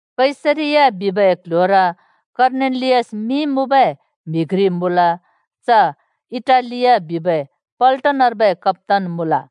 कैसरिया बिबै क्ल्ह्‍योर कर्नेलियस मिं मुँबै म्हि घ्रि मुँल। च इटालिया बिबै पल्टनर्बै कप्‍तान मुँल।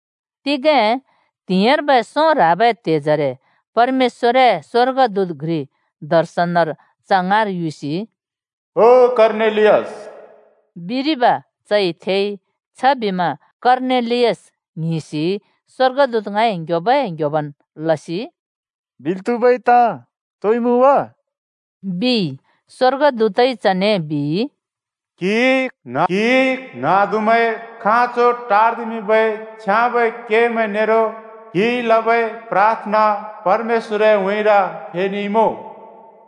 तिगें त्हिंइर्बै सों ह्राबै त्हेजरे परमेश्‍वरए स्वर्गदूत घ्रि दर्शनर च ङाँइ युसि, “ओ कर्नेलियस!” बिरिब चइ थेइ। छबिमा कर्नेलियस ङ्हिंसि स्वर्गदूत ङाँइ ङ्ह्‍योबै-ङ्ह्‍योबन् लसि, “बिल् त्हुबै ताँ तोइ मुँ वा?” बिइ। स्‍वर्गदूतइ चने बिइ, “क्हिइ ङ्हाँदुमैंए खाँचो टार्दिमिंबै छ्याँबै केमैं नेरो क्हिइ लबै प्राथना परमेश्‍वरए उँइँर फेनेइमुँ।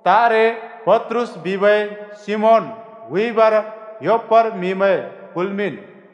तारे पत्रुस बिबै सिमोन हुइबर योप्पार म्हिमैं कुल्मिंन्।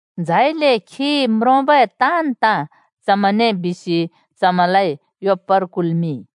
झाइले खिइ म्रोंबै ताँन् ताँ चमैंने बिसि चमैंलाइ योप्पार कुल्‍मिंइ।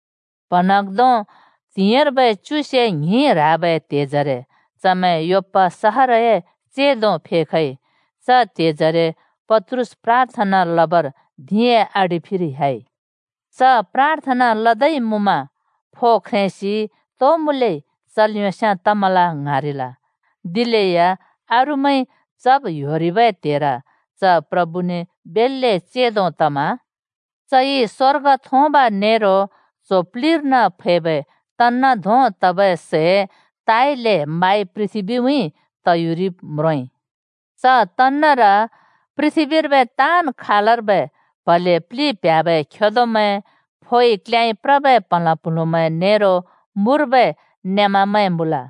प्‍हँन्हाँग्धों त्हिंइर्बै च्युसे ङ्हिं ह्राबै त्हेजरे चमैं योप्‍पा सहरए चेंदो फेखइ। च त्हेजरे पत्रुस प्राथना लबर धिंए आडि फिर ह्‍याइ। च प्राथना लदै मुँमा फो ख्रेंसि तो मुँलै चल् योंस्याँ तमल ङ्हाँरिल, दिलेया अरूमैंइ चब् ह्‍योरिबै त्हेर च प्रभुने बेल्‍ले चेंदो तमा चइ स्‍वर्ग थोंब नेरो च्हो प्लिर्न फैबै तन्‍न धों तबै सै ताले माइ पृथ्बीउँइँ तयुरिब् म्रोंइ। च च्यादरर पृथ्बीर्बै ताँन् खालर्बै प्हले प्लि प्ह्‍याबै खेदोमैं, फोइ क्ल्‍‍याँइ प्रबै प्हँलाँ प्हुँलुमैं नेरो मुर्बै नेमामैं मुँल।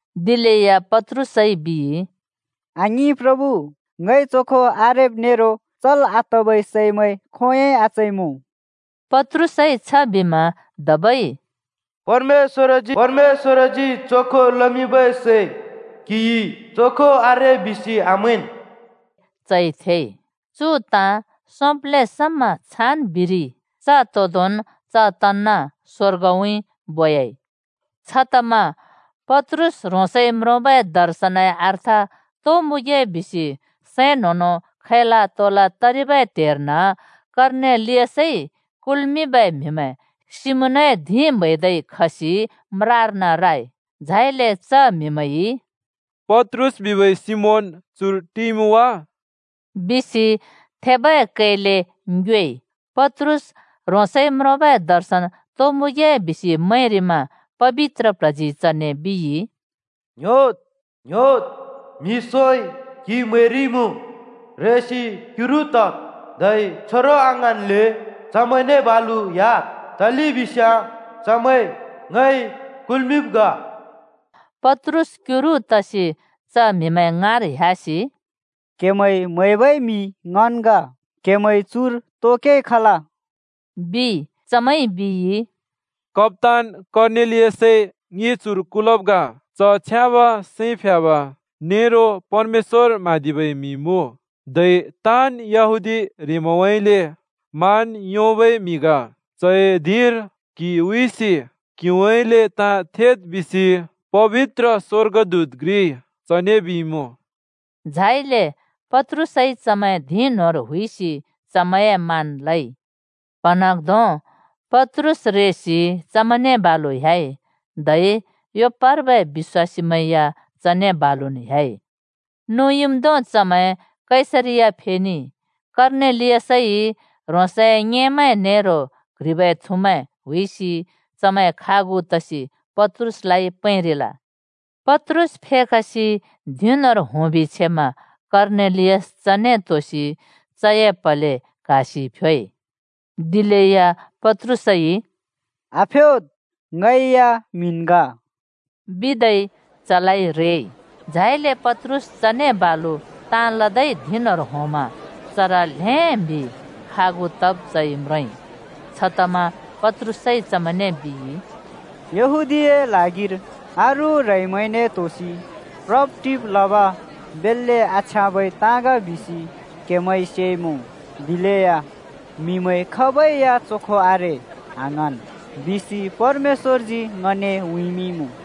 दिलेया पत्रुसइ बिइ, “आङिं, प्रभु! ङइ चोखो आरेब् नेरो चल् आतबै सैमैं खोंयोंइ आचइमुँ।” पत्रुसइ छबिमा धबै “परमेश्‍वरजी चोखो लमिंबै सै क्हिइ ‘चोखो आरे’ बिसि आमैंन्!” बिबै कै चइ थेइ। चु ताँ सोंब्‍ले समा छान् बिरिइ। च तोंदोंन् च च्यादर स्वर्गउँइँ बोयाइ। छतमा पत्रुस ह्रोंसइ म्रोंबै दर्शनए अर्थ तो मुँगे बिसि सैं न्हों-न्हों खैला-तोला तरिबै त्हेर्न कर्नेलियसइ कुल्मिंबै म्हिमैं सिमोनए धिं म्हैरि योंसि म्रार राइ। झाइले च म्हिमैंइ, “पत्रुस बिबै सिमोन चुर टिइमुँ वा?” बिसि थेबै कैले ङ्योएइ। पत्रुस ह्रोंसइ म्रोंबै दर्शन तो मुँगे बिसि मैंरिमा पबित्र प्ल्हजी चने बिइ, “ङ्‍ह्‍योद्, म्हि सोंइ क्हि म्हैरिमुँ। रेसि क्युरु तद्, धै छोरों आङ्हाँन्ले चमैंने बालु ह्‍याद्, तलेबिस्याँ चमैं ङइ कुल्मिंब् ग।” छबिमा पत्रुस क्युरु तसि च म्हिमैं ङाँर ह्‍यासि, “क्हेमैंइ म्हैबै म्हि ङन् ग। क्हेमैं चुर तो केइ खल?” बिइ। चमैंइ बिइ, “कप्‍तान कर्नेलियसइ ङि चुर कुलब् ग। च छ्याँब सैं प्ह्‍याब नेरो परमेश्‍वर म्हाँदिबै म्हि मुँ, धै ताँन् यहूदी ह्रेंमैंउँइँले मान योंबै म्हि ग। चए धिंर क्हि हुइसि क्हिउँइँले ताँ थेद् बिसि पबित्र स्वर्गदूत घ्रिइ चने बिइमुँ।” झाइले पत्रुसइ चमैं धिं न्होंर हुइसि चमैंए मान लइ। प्‍हँन्हाँग्धों पत्रुस रेसि चमैंने बालु ह्‍याइ, धै योप्पार्बै बिश्‍वासीमैं या चने बालुन् ह्‍याइ। नुँइम्धों चमैं कैसरिया फेनेइ। कर्नेलियसइ ह्रोंसए ङेमैं नेरो क्ह्रिबै थुमैं हुइसि चमैं खागु तसि पत्रुसलाइ प्रेंरिल। पत्रुस फेखसि धिं न्होंर होंबि छेमा कर्नेलियस चने त्होसि चए प्हले क्हासि फ्योइ। दिलेया पत्रुसइ, “आफ्योद्, ङैना म्हिन् ग,” बिदै चलाइ रेइ। झाइले पत्रुस चने बालु ताँ लदै धिं न्होंर होंमा चर ल्हें म्हि खागु तब चइ म्रोंइ। छतमा पत्रुसइ चमैंने बिइ, “यहूदीए ल्हागिर अरू ह्रेंमैंने त्होसि प्रब-टिब् लब बेल्‍ले आछ्याँबै ताँ ग बिसि क्हेमैंइ सेइमुँ। दिलेया ‘म्हिमैं खाबै या चोखो आरे आङ्हाँन्,’ बिसि परमेश्‍वरजी ङने उँइँमिंइँमुँ।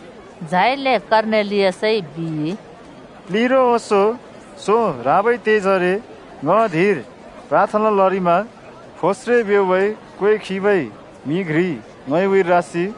झाइले कर्नेलियसइ बिइ, “प्लिरो ओंसों सों ह्राबै त्हेजरे ङ धिंर प्राथना लरिमा फोस्रे ब्योंबै क्वें खिबै म्हि घ्रि ङए उँइँर रासि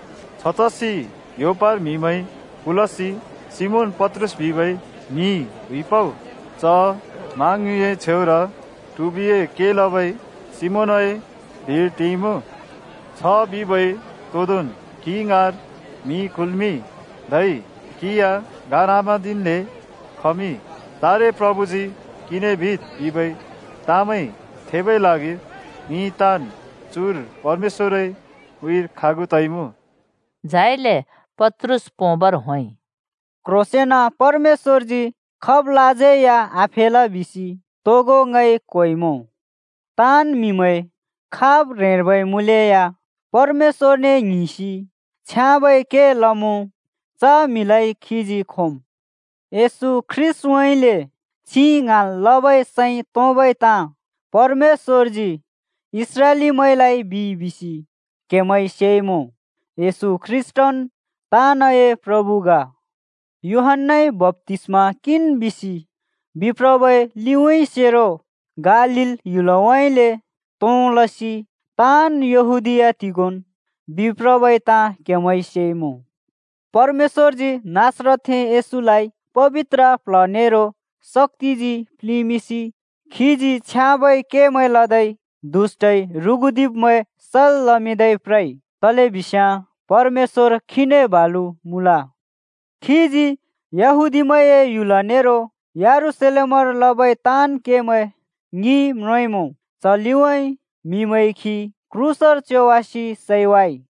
छतसि योप्पार म्हिमैं कुलसि सिमोन पत्रुस बिबै म्हि हुइपउ। च मा ङ्युँइए छेउर ट्हिबिए के लबै सिमोनए धिंर टिइमुँ।’ छ बिबै तोंदोंन क्हि ङाँर म्हि कुल्मिंइ, धै क्हि या गार आम्हाँदिन्ले खमिंइ। तारे प्रभुजी क्हिने बिद् बिबै ताँमैं थेबै ल्हागिर ङि ताँन् चुर परमेश्‍वरए उँइँर खागु तइमुँ।” झाइले पत्रुस पोंबर होंइ, “क्ह्रोंसेंन परमेश्‍वरजी खाबलाज्यै आफेल बिसि ङइ तोगो क्होइमुँ। ताँन् म्हिमैं खाब ह्रेंर्बै मुँलेया परमेश्‍वरने ङ्हिंसि छ्याँबै के लमुँ च म्हिमैंलाइ खीजी खोमुँ। येशू ख्रीष्‍टउँइँले छिं ङ्हाँल् लबै सैं तोंबै ताँ परमेश्‍वरजी इस्राएलीमैंलाइ बिइ बिसि क्हेमैंइ सेइमुँ। (येशू ख्रीष्‍टन् ताँनए प्रभु ग।) यूहन्‍नाइ बप्‍तिस्मा किंन् बिसि बिप्रबै लिउँइँसेरो गालील ह्‍युलउँइँले तों लसि ताँन् यहूदीया तिगोंन् बिप्रबै ताँ क्हेमैंइ सेइमुँ। परमेश्‍वरजी नासरतथें येशूलाइ पबित्र प्ल्ह नेरो शक्‍तिजी प्लिंमिंसि खीजी छ्याँबै केमैं लदै, दुष्‍टइ ह्रुगुदिब्मैं सल् लमिंदै प्रइ, तलेबिस्याँ परमेश्‍वर खीने बालु मुँल। खीजी यहूदीमैंए ह्‍युल नेरो यरूशलेमर लबै ताँन् केमैं ङिइ म्रोंइँमुँ। च लिउँइँ म्हिमैंइ खी क्रूसर च्योवासि सैवाइ।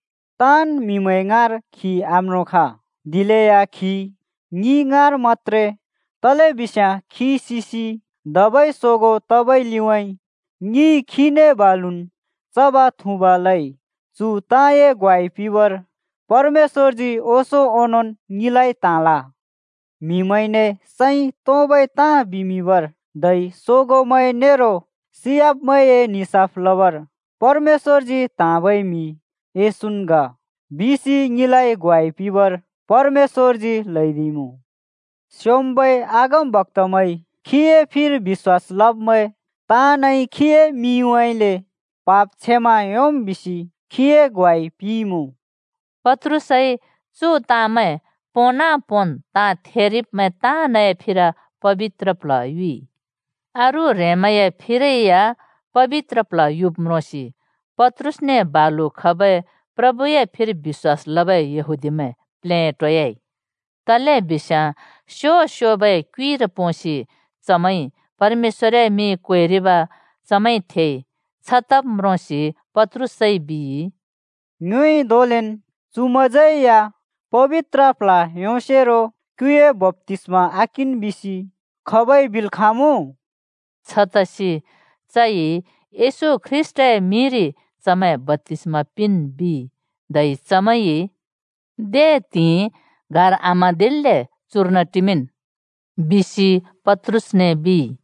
ताँन् म्हिमैं ङाँर खी आम्रोंखा, दिलेया खी ङि ङाँर मत्‍त्रे, तलिबिस्याँ खी सिसि धबै सोगों तबै लिउँइँ ङिइ खीने बालुन् चब-थुँब लइ। चु ताँए ग्वाइ पिंबर परमेश्‍वरजी ओंसों ओंनोंन् ङिलाइ त्हाँल। ‘म्हिमैंने सैं तोंबै ताँ बिमिंबर’ धै ‘सोगोंमैं नेरो सियाब्मैंए निसाफ लबर परमेश्‍वरजी त्हाँबै म्हि येशून् ग,’ बिसि ङिलाइ ग्वाइ पिंबर परमेशजी ल्हैदिइमुँ। स्योंम्बै अगमबक्‍तामैंइ ‘खीए फिर बिश्‍वास लब्मैं ताँनइ खीए मिंउँइँले पाप क्षमा योंम्,’ बिसि खीए ग्वाइ पिंइँमुँ।” पत्रुसइ चु ताँमैं पोंना-पोंन् ताँ थेरिब्मैं ताँनए फिर पबित्र प्ल्ह युइ। अरू ह्रेंमैंए फिरै या पबित्र प्ल्ह युब् म्रोंसि पत्रुसने बालु खबै प्रभुए फिर बिश्‍वास लबै यहूदीमैं बेल्‍ले प्लेटोयाइ। तलेबिस्याँ स्यो-स्योबै क्युइर पोंसि चमैंइ परमेश्‍वरए मिं क्वेरिब चमैंइ थेइ। छतब् म्रोंसि पत्रुसइ बिइ, “ङ्योइ धोंलेन् चुमैंज्यै या पबित्र प्ल्ह योंसेरो क्युए बप्‍तिस्मा आकिंन् बिसि खाबइ बिल् खाँमुँ?” छतसि चइ येशू ख्रीष्‍टए मिंरि चमैं बप्‍तिस्मा पिंन् बिइ। धै चमैंइ “दे त्हिंइ गार आम्हाँदिन्ले चुर्न टिमिंन्,” बिसि पत्रुसने बिइ।